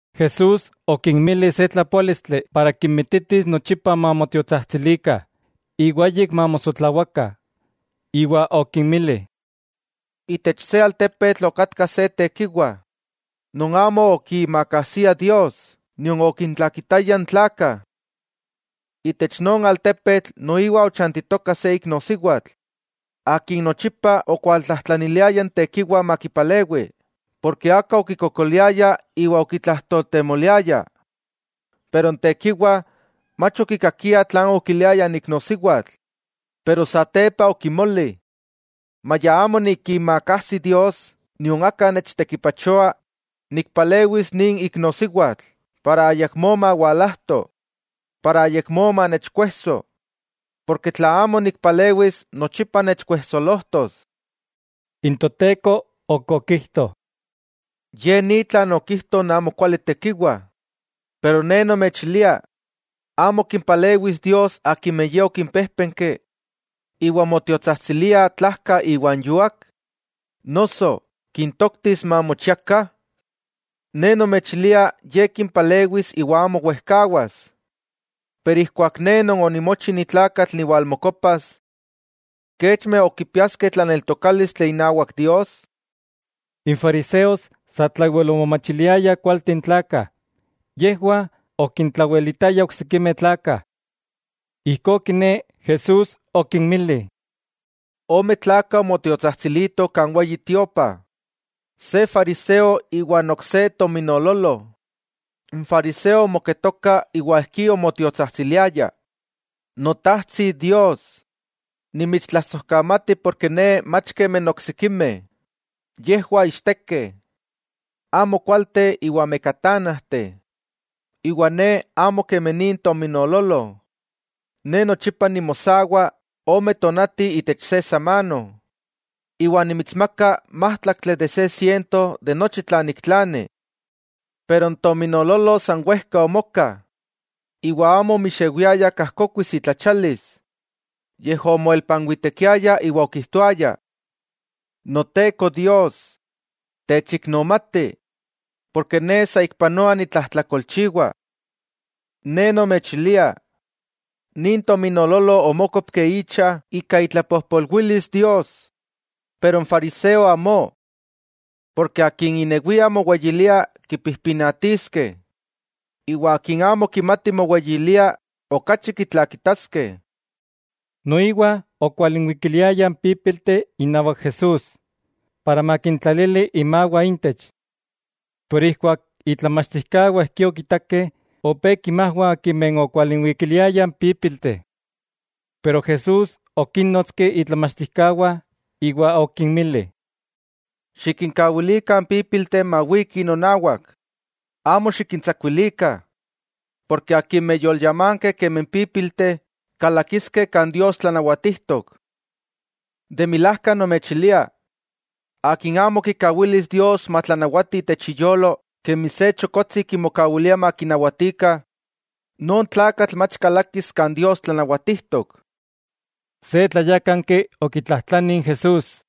Jesús okinmili se tlapoálistli para kinmititis nochipa mamotiotsajtsilikah, iwa ayik mamosotlawakah. Iwa okinmili: —Itech se altepetl okatka se tekiwa, non amo okiimakajsia Dios, nion okintlakitaya n tlakah. Itech non altepetl, noiwa ochantitoka se iknosiwatl, akin nochipa okualtlajtlaniliaya n tekiwa makipalewi porke aka okikokoliaya iwa okitlajtoltemoliaya. Pero n tekiwa mach okikakia tlan okiliaya n iknosiwatl, pero satepa okimoli: “Maya amo nikiimakajsi Dios nion aka nechtekipachoa, nikpalewis nin iknosiwatl iwa ayakmó mawalajto, para ayakmó manechkuejso, porke tla amo nikpalewis nochipa nechkuejsolojtos.” N Toteko ok okijto: —Ye ni tlan okijto n amokuali tekiwa. Pero Ne nomechilia: ¿Amo kimpalewis Dios akimeh Ye okimpéjpenki, iwa motiotsajtsiliah tlajka iwa n yuak?, noso ¿kintoktis mamochiakah? Ne nomechilia Ye kimpalewis iwa amo wejkawas. Pero ijkuak Ne Non onimochi ni tlakatl niwalmokopas, ¿kechmeh ok kipiaskeh tlaneltokálistli inawak Dios? N fariseos satlawel omomachiliayah kualteh n tlakah. Yejwah okintlawelitayah oksikimeh tlakah. Ijkó kiné Jesús okinmili: —Ome tlakah omotiotsajtsilitoh kan Weyi Tiopa: se fariseo, iwa n ok se tominoololo. N fariseo omoketoka iwa ijkí omotiotsajtsiliaya: “Notajtsi Dios, nimitstlasojkamati porke ne mach kemi n oksikimeh, yejwah ichtekeh, amokualteh iwa mekatánajteh, iwa ne amo kemi nin tominoololo. Ne nochipa nimosawa ome tonati itech se samano, iwa nimitsmaka májtlaktli de se siento de nochi tlan niktlani.” Pero n tominoololo san wejka omoka iwa amo omixewiaya kajkokuis itlachialis, yej omoelpanwitekiaya iwa okijtoaya: “¡Noteko Dios, techiknomati, ne saikpanoa nitlajtlakolchiwa!” Ne nomechilia, nin tominoololo omókopki icha ika itlapojpolwilis Dios, pero n fariseo amó. Porke akin inewia moweyilia kipijpinatiskeh, iwa akin amo kimati moweyilia, okachi kitlakitaskeh. Noiwa okwalinwikiliayah n pípilteh inawak Jesús, para makintlalili imawah intech. Pero ijkuak itlamachtijkawah ijkí okitakeh, opé kimajwah akimeh okwalinwikiliayah n pípilteh. Pero Jesús okínnotski itlamachtijkawah iwa okinmili: —Xikinkawilikah n pípilteh mawikih nonawak, amo xikintsakuilikah, porke akimeh yolyamankeh kemi n pípilteh, kalakiskeh kan Dios tlanawatijtok. De milajka nomechilia, akin amo kikawilis Dios matlanawati itech iyolo kemi se chokotsi kimokawilia makinawatikah, non tlakatl mach kalakis kan Dios tlanawatijtok. Se tlayákanki okitlajtlani n Jesús: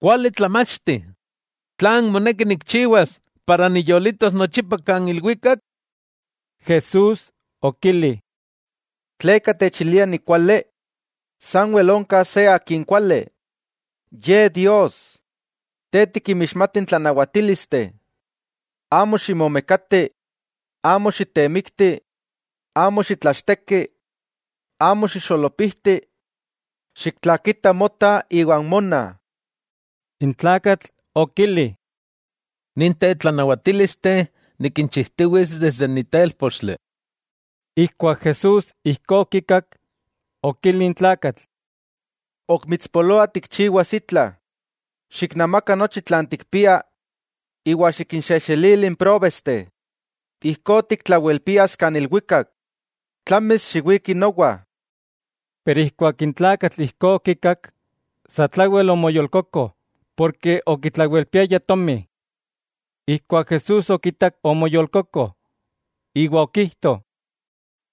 —Kuali tlamachti, ¿tlan moneki nikchiwas para niyolitos nochipa kan ilwikak? Jesús okili: —¿Tleka techilia nikuali? Sanwel onka se Akin kuali, Ye Dios. Te tikinmixmati n tlanawatílisteh: “Amo ximomekati; amo xitemikti; amo xitlachteki; amo xixolopijti; xiktlakita mota iwa n mona.” N tlakatl okili: —Ninteh tlanawatílisteh nikinchijtiwits desde ni telpotsintli. Ijkuak Jesús ijkó okikak, okili n tlakatl: —Ok mitspoloa tikchiwas itla: xiknamaka nochi tlan tikpia iwa xikinxejxelili n próbesteh, ijkó tiktlawelpias kan ilwikak; tlamis xiwiki nowa. Pero ijkuak n tlakatl ijkó okikak, satlawel omoyolkoko, porke okitlawelpiaya tomi. Ijkuak Jesús okitak omoyolkoko, iwa okijto: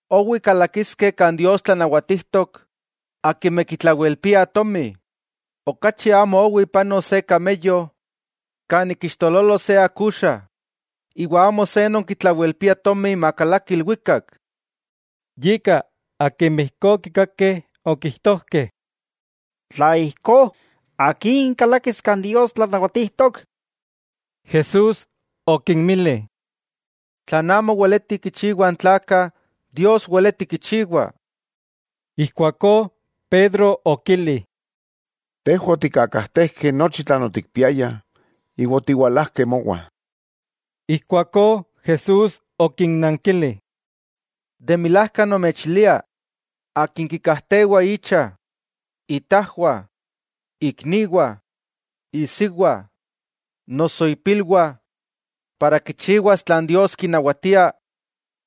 —¡Owi kalakiskeh kan Dios tlanawatijtok akimeh kitlawelpiah tomi! Okachi amo owi panos se “kameyo” kan ik iixtololo se akuxa, iwa amo se non kitlawelpia tomi makalaki ilwikak. Yika akimeh ijkó okikakeh okijtojkeh: —Tla ijkó, ¿akin kalakis kan Dios tlanawatijtok? Jesús okinmili: —Tlan amo weletih kichiwah n tlakah, Dios weleti kichiwa. Ijkuakó, Pedro okili: —Tejwah otikkakajtejkeh nochi tlan otikpiayah, iwa otiwalajkeh mowah. Ijkuakó Jesús okinnankili: —De milajka nomechilia, akin kikakajtewa icha, itajwah, ikniwah, isiwa, noso ipilwah, para kichiwas tlan Dios kinawatia,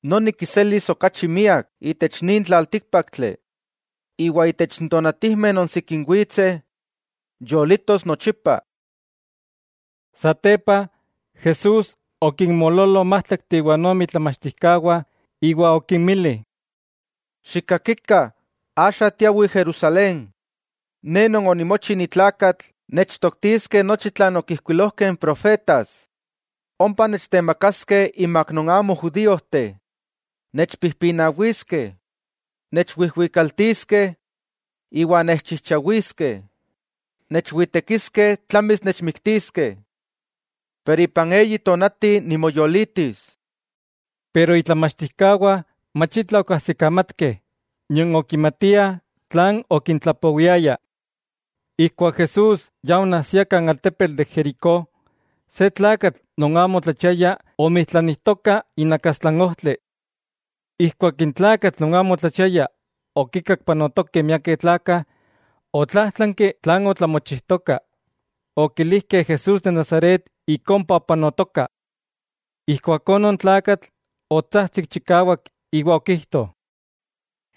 noni kiselis okachi miak itech nin tlaltíkpaktli; iwa itech n tonatijmeh non sikin witseh, yolitos nochipa. Satepa, Jesús okinmoololo n májtlakteh iwa ome itlamachtijkawah iwa okinmili: —Xikkakikah, axa tiawih Jerusalén, Ne Non onimochi ni tlakatl nechtoktiskeh nochi tlan okijkuilojkeh n profetas. Ompa nechtemakaskeh inmak non amo judíojteh, nechpijpinawiskeh, nechwijwikaltiskeh iwa nechchijchawiskeh. Nechwitekiskeh, tlamis nechmiktiskeh. Iwa ipan eyi tonati nimoyolitis. Itlamachtijkawah mach itla okajsikamatkeh, nion okimatiah tlan okintlapowiaya. Ijkuak Jesús ya onajsia kan altepetl de Jericó, se tlakatl non amo otlachiaya omijtlanijtoka inakastla n ojtli. Ijkuak n tlakatl non amo otlachiaya okinkak panotokeh miakeh tlakah, otlájtlanki tlan otlamochijtoka. Okilijkeh Jesús de Nazaret ik ompa opanotoka. Ijkuakó non tlakatl otsajtsik chikawak iwa okijto: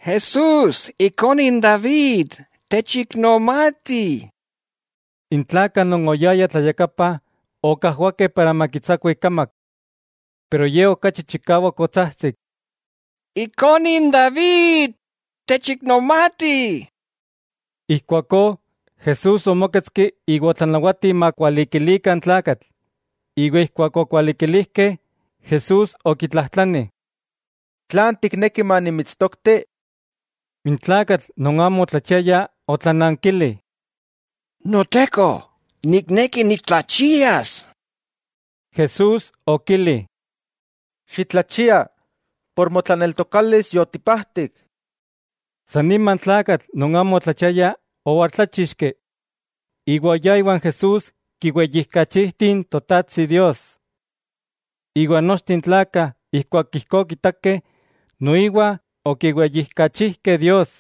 —¡Jesús, Ikone n David, techiknomati! N tlakah non oyayah tlayakapa okajwakeh para makitsakua ikamak. Pero ye okachi chikawak otsajtsik: —¡Ikone n David, techiknomati! Ijkuakó Jesús omóketski iwa otlanawati makualikilikah n tlakatl; iwa ijkuak okualikilijkeh, Jesús okitlajtlani: —¿Tlan tikneki manimitstokti? N tlakatl non amo otlachiaya otlanankili: —Noteko, nikneki nitlachias. Jesús okili: —¡Xitlachia! Por motlaneltokalis yotipajtik. San nima n tlakatl non amo otlachiaya owaltláchixki, iwa oyá iwan Jesús kiweyijkachijti n Totajtsi Dios. Iwa nochteh n tlakah ijkuak ijkó okitakeh, noiwa okiweyijkachijkeh Dios.